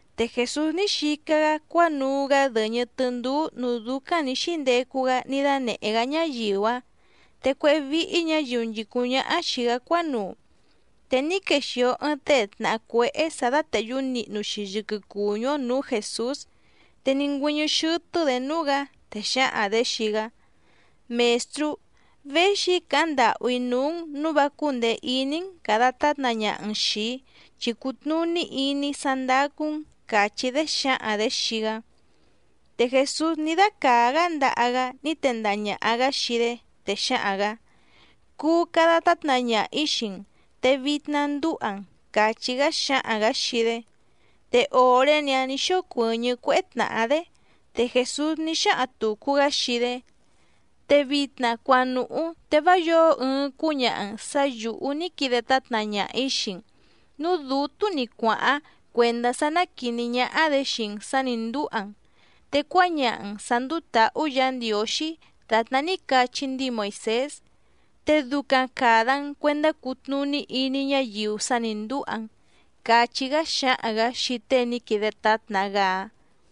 Te Jèsús ní xica‑gá cuánuu‑gá dɨ̀ñɨ tɨndúú nǔú dúcáⁿ nǐ xíndecu‑gá ní dánèhé‑gá ñáyiu‑áⁿ, te cuéhé víhí ñǎyiu nchìcúⁿ ñáhá xìi‑gá cuánuu. Te ní quexìo ɨɨⁿ tée tnàhá cuéhé sǎ dátèhyú nihnu‑xi yɨquɨ cùñú‑ó nǔú Jèsús, te ní ngüɨ́ñɨ́ xɨ́tɨ́‑dě núú‑gǎ, te xǎhaⁿ‑dě xii‑gá: —Mèstrú, véxi‑í càháⁿ ndàhú‑í núú‑n nǔu vá cúndèe iní‑n càda tátna ñaha‑n xìi‑í, chi cùtnuní iní‑í sá ndácú‑n —càchí‑dé xǎhaⁿ‑dě xii‑gá. Te Jèsús ní dácàá‑gá ndaha‑gá ní tendaha ñàha‑gá xii‑dé, te xǎhaⁿ‑gǎ: —Cuu cada tátna ñaha‑ǐ xii‑n, te vitna ndúha‑n —càchí‑gá xǎhaⁿ‑gǎ xii‑dé. Te òré‑ni‑áⁿ nǐ xócuɨ̀ñɨ́ cuéhé tnàhá‑dé. Te Jèsús ní xáhaⁿ tùcu‑gá xii‑dé: —Te vitna cuanùhú te vá yǒo ɨɨⁿ cúñaha‑n sǎ yǔhú ní quide tátna ñaha‑ǐ xii‑n, núú dǔtú‑ni cuàháⁿ cuèndá sá ná quìní ñáhá‑dě xii‑n sǎ nǐ ndúha‑n, te cuáñaha‑n sǎ ndúú tǎhú Yǎ Ndiǒxí dàtná ní cachí ndíi Moìsés. Te ducaⁿ càda‑n cuendá cutnùní iní ñáyiu sá nǐ ndúha‑n —càchí‑gá xǎhaⁿ‑gǎ xii tée ní quide tátna‑gá‑áⁿ.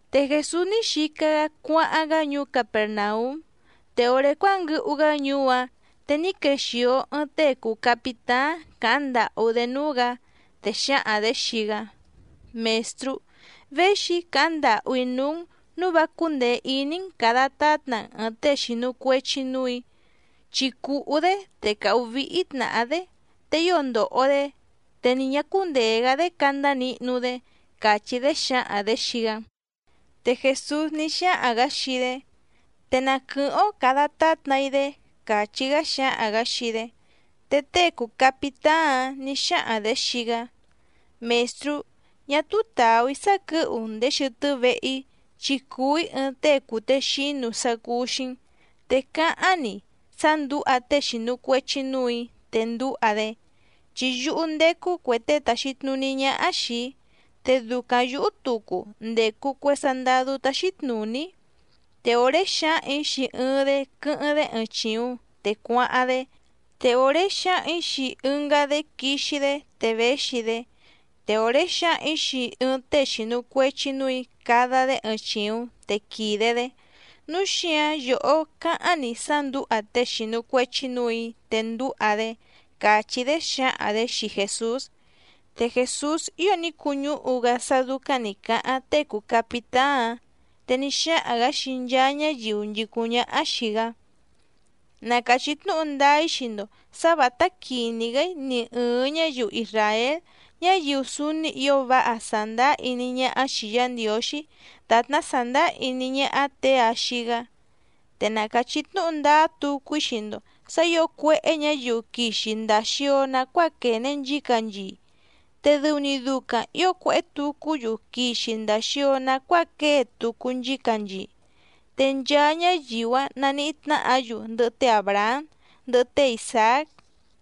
Te Jèsús ní xica‑gá cuáháⁿ‑gá ñuú Capèrnaúm. Te òré cuánguɨhu‑gá ñuú‑áⁿ te ní quexìo ɨɨⁿ tée cùu capitáⁿ càháⁿ ndàhú‑dé núú‑gǎ, te xǎhaⁿ‑dě xii‑gá: —Mèstrú, véxi‑í càháⁿ ndàhú‑í núú‑n nǔu vá cúndèe iní‑n càda tátna‑n ɨ̀ɨⁿ tée xìnu cuechi núù‑í, chi cùhú‑dé te càhú víhí tnàhá‑dé, te ío ndòho‑dé te ni ñǎ cúndèe‑gá‑dé candá nihnu‑dé —càchí‑dé xǎhaⁿ‑dě xii‑gá. Te Jèsús ní xáhaⁿ‑gǎ xii‑dé: —Te na quɨ̀hɨ́ⁿ‑ó càda tátna‑í‑dé —càchí‑gá xǎhaⁿ‑gǎ xii‑dé. Te tée cùu capitáⁿ‑áⁿ nǐ xáhaⁿ‑dě xii‑gá: —Mèstrú, ñá túú tàú‑í sá quɨ̌hu‑n ndèé xɨtɨ́ vehe‑í, chi cùu‑í ɨɨⁿ tée cùtexínu sá cúú‑xí‑n, te cáháⁿ‑ni sá ndǔha tée xìnu cuechi núù‑í te ndúha‑dé. Chi yúhú ndècu cue tée tàxi tnuní ñáhá xìi‑í, te ducaⁿ yǔhú tucu ndècu cue sandadú táxí tnùní‑í. Te òré xǎhaⁿ‑ǐ xii ɨɨⁿ‑dé quɨ́hɨ́ⁿ‑dé ɨɨⁿ chìuⁿ te cuáháⁿ‑dé, te òré xǎhaⁿ‑ǐ xii ɨngá‑dé quixi‑dé te véxi‑dé, te òré xǎhaⁿ‑ǐ xii ɨɨⁿ tée xìnu cuechi núù‑í cada‑dé ɨɨⁿ chìuⁿ te quìde‑dé. Núu xíǎⁿ yòhó cáháⁿ‑ni sá ndǔha tée xìnu cuechi núù‑í te ndúha‑dé —càchí‑dé xǎhaⁿ‑dě xii Jèsús. Te Jèsús ío ní cuñúhu‑gá sá dúcáⁿ nǐ cáháⁿ tée cùu capitáⁿ‑áⁿ, te ní xáhaⁿ‑gǎ xii nchaa ñáyiu nchìcúⁿ ñáhá xìi‑gá: —Na càchí tnúhu ndáá‑í xii‑ndo sǎ vǎtá quìní‑gá‑í ni ɨ̀ɨⁿ ñáyiu isràél, ñáyiu súúní ǐo váha sàndáá iní ñáhá xìi Yá Ndiǒxí dàtná sàndáá iní ñáhá těe‑a xii‑gá. Te na càchí tnúhu ndáá tucu‑í xii‑ndo sǎ ǐo cuéhé ñǎyiu quixi ndàa xio nacuáa quène nchícanchii, te dɨu‑ni ducaⁿ ǐo cuéhé tucú‑yu quixi ndàa xio nacuáa quée tucu nchícanchii. Te nchaa ñáyiu‑áⁿ naníhí tnáhǎ‑yu ndɨhɨ té Àbrahám, ndɨhɨ té Isàác,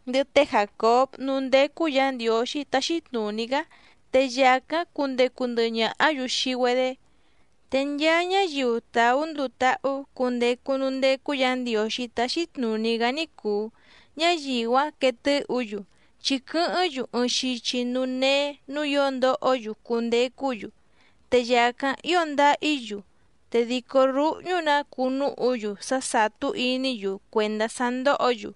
ndɨhɨ té Jàcób núú ndécú Yǎ Ndiǒxí táxí tnùní‑gá te yàcáⁿ cundecu ndɨhɨ ñàhá‑yu xii‑güedé. Te nchaa ñáyiu tàú nduu táhú cundecu núú ndécú Yǎ Ndiǒxí táxí tnùní‑gá ní cùu, ñáyiu‑áⁿ quee tɨ́hǔ‑yu, chi quɨ́hɨ́ⁿ‑yu ɨɨⁿ xichi núú néé nǔú ǐo ndohó‑yu cundecú‑yu, te yàcáⁿ ío ndáhí‑yu, te dìcó rúhñú‑nǎ cuu núhu‑yu sá sàtú iní‑yu cuèndá sá ndóhǒ‑yu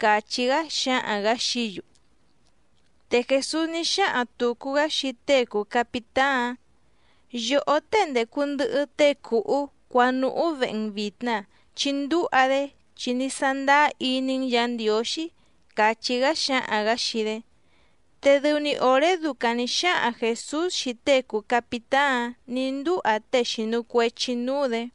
—càchí‑gá xǎhaⁿ‑gǎ xií‑yu. Te Jèsús ní xáhaⁿ tùcu‑gá xii tée cùu capitáⁿ‑áⁿ: —Yòhó tée ndècu ndɨhɨ tée cùhú cuanùhú vehe‑n vìtna chi ndúha‑dé chi ní sándáá iní‑n Yǎ Ndiǒxí —càchí‑gá xǎhaⁿ‑gǎ xii‑dé. Te dɨu‑ni òré ducaⁿ nǐ xáhaⁿ Jèsús xii tée cùu capitáⁿ‑áⁿ nǐ ndúha tée xìnu cuechi núú‑dě.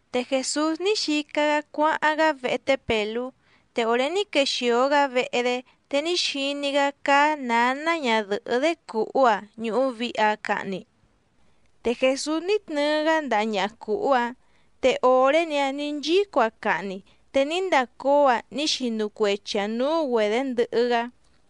Te Jèsús ní xica‑gá cuáháⁿ‑gá vehe té Pèlú, te òré ní quexìo‑gá vehe‑dé te ní xiní‑gá cáá nǎná ñadɨ̀hɨ́‑dé cùhú‑aⁿ ñùhu vihi‑aⁿ cahni. Te Jèsús ní tnɨɨ‑gá ndaha ñaha cùhú‑áⁿ, te òré‑ni‑áⁿ nǐ nchíco‑aⁿ cahni te ní ndacóo‑aⁿ ní xinu cuechi‑aⁿ nǔú‑güedě ndɨhɨ‑gá.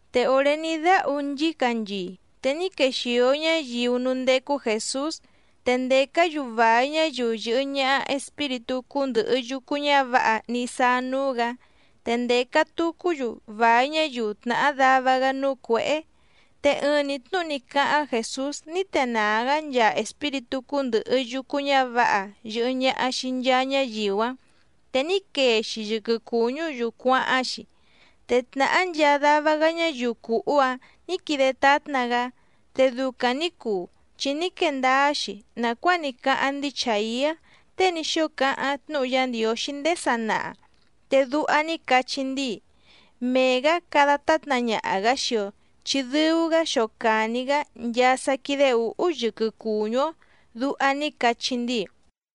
Te òré ní dáhu nchícanchii te ní quexìo ñáyiu núú ndécú Jèsús, te ndècá‑yu vài ñáyiu yɨ̀hɨ ñaha espíritú cúndɨ̀hɨ yucu ñávǎha ní sáá núú‑gǎ te ndèca tucú‑yu vài ñáyiu tnàhá dava‑gá núú cuěhé. Te ɨɨⁿ‑ni tnúhu ní cáháⁿ Jèsús ní tenàá‑gá nchaa espíritú cúndɨ̀hɨ yucu ñávǎha yɨ̀hɨ ñaha xii nchaa ñáyiu‑áⁿ, te ní quee‑xi yɨquɨ cùñú‑yu cuáháⁿ‑xi. Te tnàhá nchaa dava‑gá ñáyiu cùhú‑áⁿ nǐ quide tátna‑gá. Te ducaⁿ nǐ cuu chi ní quee ndáá‑xi nàcuáa ní cáháⁿ ndíi Chàiá tée ní xóo cáháⁿ tnúhu Yá Ndiǒxí ndéé sanaha, te duha ní cachí ndíi: “Mee‑gǎ cada tátna ñaha‑gǎ xii‑o, chi dɨu‑gá xocàni‑gá nchaa sá quídé ǔhú yɨquɨ cùñú‑ó”, duha ní cachí ndíi.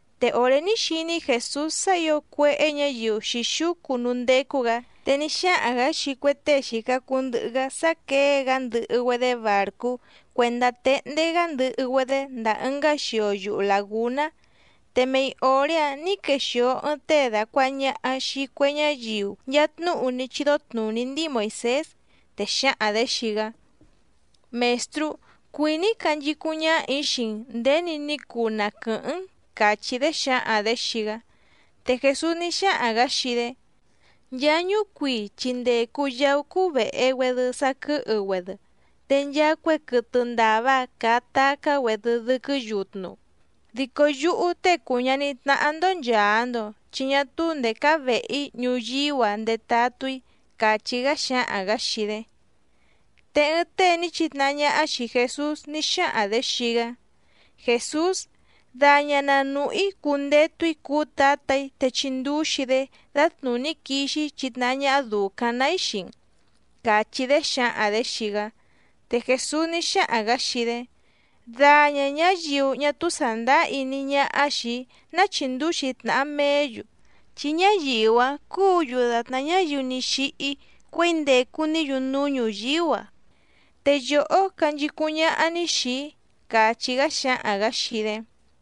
Te òré ní xiní Jèsús sá ǐo cuéhé ñǎyiu xǐxúcu núú ndécú‑gǎ, te ní xáhaⁿ‑gǎ xii cue tée xìca cuu ndɨhɨ‑gá sá quěe‑gá ndɨhɨ‑güedé bàrcú cuèndá téhndé‑gá ndɨhɨ‑güedé ndàa ɨngá xio yuhu làgúná. Te mei òré‑áⁿ nǐ quexìo ɨɨⁿ tée dàcuaha ñaha xii cue ñáyiu nchaa tnúhu ní chídó tnùní ndíi Moìsés, te xǎhaⁿ‑dě xii‑gá: —Mèstrú, cuìní‑í canchicúⁿ ñáhà‑í xii‑n nděni ní cuu na quɨ̀hɨ́ⁿ‑n —càchí‑dé xǎhaⁿ‑dě xii‑gá. Te Jèsús ní xáhaⁿ‑gǎ xii‑dé: —Nchaa ñúcuii chi ndècu yaú cúú vèhe‑güedɨ saquɨ́hɨ‑güedɨ, te nchaa cue quɨtɨ ndàva caa tacá‑güedɨ dɨquɨ́ yutnu. Dico yúhú Tée cùu ñaní tnáhá‑ndó nchàa‑ndo chi ñá túú ndèé cáá vèhe‑í ñuyíú‑a ndetatú‑í —càchí‑gá xǎhaⁿ‑gǎ xii‑dé. Te ɨɨⁿ tée ní chitnahá ñáhá xìi Jesús ní xáhaⁿ‑dě xii‑gá: —Jèsús, daña na nùhú‑í cundetu‑í cuú tǎtà‑í te chindúxi‑í‑dé dǎtnùní quixi‑í chitnahá ñáhá dùcaⁿ‑ná‑í xii‑n —càchí‑dé xǎhaⁿ‑dě xii‑gá. Te Jèsús ní xáhaⁿ‑gǎ xii‑dé: —Daña ñǎyiu ñá túú sàndáá iní ñáhá xìi‑í ná chìndúxi tnàha meé‑yu, chi ñáyiu‑áⁿ cúǔ‑yu dàtná ñáyiu ní xíhí cuěi ndècu‑ní‑yu núú ñuyíú‑a, te yòhó canchicúⁿ ñáhá‑ní xìi‑í —càchí‑gá xǎhaⁿ‑gǎ xii‑dé.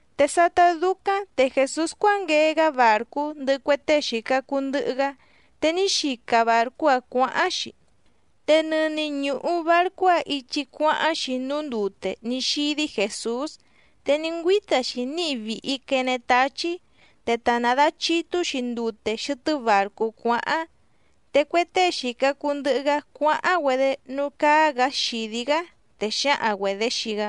Te sátá dúcáⁿ te Jèsús cuánguee‑gá bàrcú ndɨhɨ cue tée xìca cuu ndɨhɨ‑gá, te ní xica bàrcú‑áⁿ cuǎháⁿ‑xi. Te nɨni ñùhu barcú‑áⁿ ichi cuáháⁿ‑xi núú ndute ní xídí Jèsús, te ní ngüíta‑xi níhi vìhi quene táchí, te ta nàdachitú‑xi ndute xɨtɨ́ bàrcú cuáháⁿ. Te cue tée xìca cuu ndɨhɨ‑gá cuáháⁿ‑güedé núú cáá‑gǎ xìdí‑gá, te xǎhaⁿ‑güedě xii‑gá: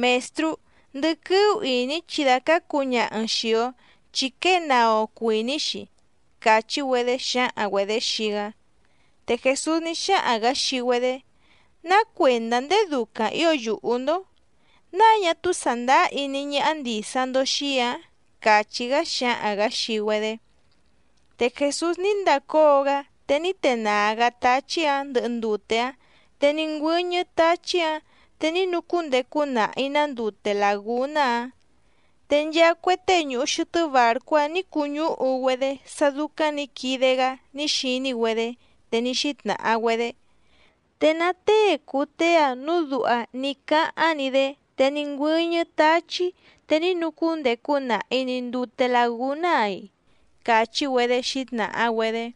—¡Mèstrú, ndɨquɨ́ú ìní chi dàcácu ñaha‑n xìi‑o chi quée naa‑o cuìní‑xi! —càchí‑güedé xǎhaⁿ‑güedě xii‑gá. Te Jèsús ní xáhaⁿ‑gǎ xii‑güedé: —¿Ná cuèndá ndéé ducaⁿ ǐo yùhú‑ndó? ¿Náa ñá túú sàndáá iní ñáhá ndìsa‑ndo xii‑í‑ǎⁿ? —càchí‑gá xǎhaⁿ‑gǎ xii‑güedé. Te Jèsús ní ndacóo‑gá te ní tenàá‑gá táchí‑ǎⁿ ndɨhɨ ndute‑áⁿ, te ní ngüɨ́ñɨ́ táchí‑ǎⁿ te ní nucúndecu nahi‑nǎ ndute làgúná‑áⁿ. Te nchaa cue tée ñùhu xɨtɨ́ bàrcú‑áⁿ nǐ cuñúhu‑güedé sá dúcáⁿ nǐ quide‑gá ní xiní‑güedé, te ní xítnàha‑güedé: —¿Te ná tée cùu tée‑a núu duha ní cáháⁿ‑ni‑dé te ní ngüɨ́ñɨ́ táchí te ní nucúndecu nahi‑ni ndùte lagúná‑a‑i? —càchí‑güedé xǐtnàha‑güedé.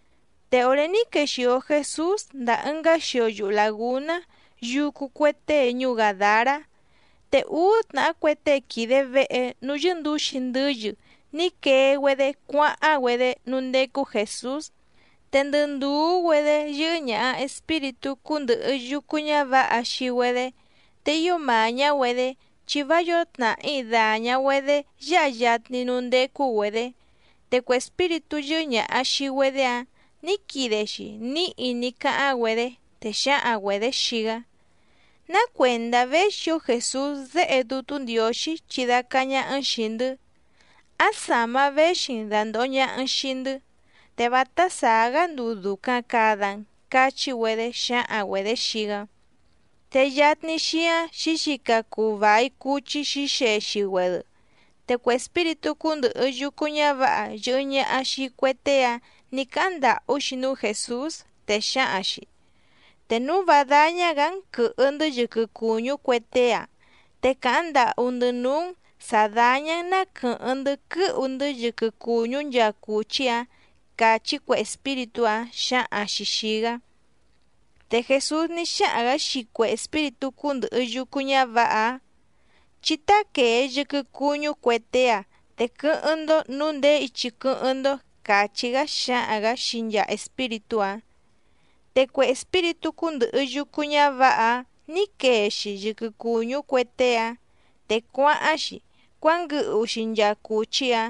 Te òré ní quèxio Jesús ndàa ɨngá xio yuhu làgúná yucu cue tée ñuú Gàdará, te úú tnàhá cue tée quìde vehe núú yɨ́ndǔxi ndɨ́yɨ ní quee‑güedé cuáháⁿ‑güedé núú ndécú Jèsús, te ndɨ ndùú‑güedé yɨ́hɨ́ ñàha espíritú cúndɨ̀hɨ yucu ñávǎha xii‑güedé, te ío màñá‑güedé chi vá yǒo tnàhí dàña‑güedé yáha yatni núú ndécú‑güedě. Te cue espíritú yɨ́hɨ́ ñàha xii‑güedé‑áⁿ nǐ quide‑xi níhi ní cáháⁿ‑güedé, te xǎhaⁿ‑güedě xii‑gá: —¿Ná cuèndá véxi‑ǒ Jèsús Déhe Dútú Ndiǒxí chidácá ñáhá‑n xìi‑ndɨ́? ¿Áⁿ sàma véxi‑n dàndoho ñaha‑n xii‑ndɨ́? Te vátá sàá‑gá nduu dùcaⁿ cada‑n —cachí‑güedé xǎhaⁿ‑güedě xii‑gá. Te yatni xíáⁿ xǐxica cuu vài cuchí xǐxexi‑güedɨ. Te cue espíritú cúndɨ̀hɨ yucu ñávǎha yɨ̀hɨ ñaha xii cue tée‑áⁿ nǐ cáháⁿ ndàhú‑xi núú Jèsús, te xǎhaⁿ‑xi: —Te núu vá dáñá‑gǎ‑n quɨ̀hɨ‑ndɨ́ yɨquɨ cùñú cue tée‑a, te càháⁿ ndàhú‑ndɨ́ núú‑n sǎ dàña‑n na quɨ́hɨ́ⁿ‑ndɨ́ quɨ́hu‑ndɨ́ yɨquɨ cùñú nchaa cùchí‑ǎⁿ —càchí cue espíritú‑áⁿ xǎhaⁿ‑xi xìi‑gá. Te Jèsús ní xáhaⁿ‑gǎ xii cue espíritú cúndɨ̀hɨ yucu ñávǎha‑áⁿ: —Chí táquèe yɨquɨ cuñú cue tée‑áⁿ te quɨ́hɨ́ⁿ‑ndó nǔu ndèé ichi quɨ́hɨ́ⁿ‑ndó —càchí‑gá xǎhaⁿ‑gǎ xii nchaa espíritú‑áⁿ. Te cue espíritú cúndɨ̀hɨ yucu ñávǎha‑áⁿ nǐ quee‑xi yɨquɨ cùñú cue tée‑áⁿ, te cuáháⁿ‑xi cuánguɨhu‑xi nchaa cùchí‑áⁿ.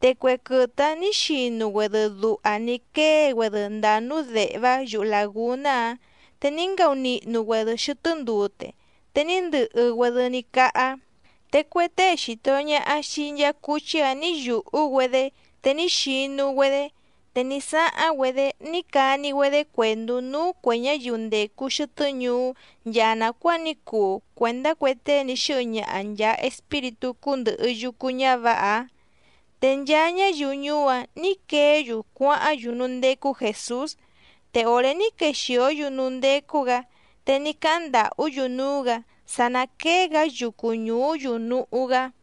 Te cue quɨtɨ‑áⁿ nǐ xinu‑güedɨ duha ní quée‑güedɨ ndàa núú dèhvá yuhu làgúná‑áⁿ, te ní ngaunihnu‑güedɨ xɨtɨ́ ndute, te ní ndɨhɨ‑güedɨ ní cáhá. Te cue tée xìto ñaha xii nchaa cuchí‑áⁿ nǐ yùhú‑güedé te ní xinu‑güedé, te ní sáháⁿ‑güedé ní cani‑güedé cuèndú núú cuè ñáyiu ndècu xɨtɨ́ ñuú nchaa nàcuáa ní cuu cuèndá cue tée ní xɨ́hɨ ñaha nchàa espíritú cúndɨ̀hɨ yucu ñávǎha‑áⁿ. Te nchaa ñáyiu ñuú‑áⁿ nǐ queé‑yu cuáháⁿ‑yu núú ndécú Jèsús. Te òré ní quexìó‑yu núú ndécú‑gǎ te ní cáháⁿ ndàhú‑yu núú‑gǎ sá ná quèe‑gá yucu ñuú‑yu núhú‑gá.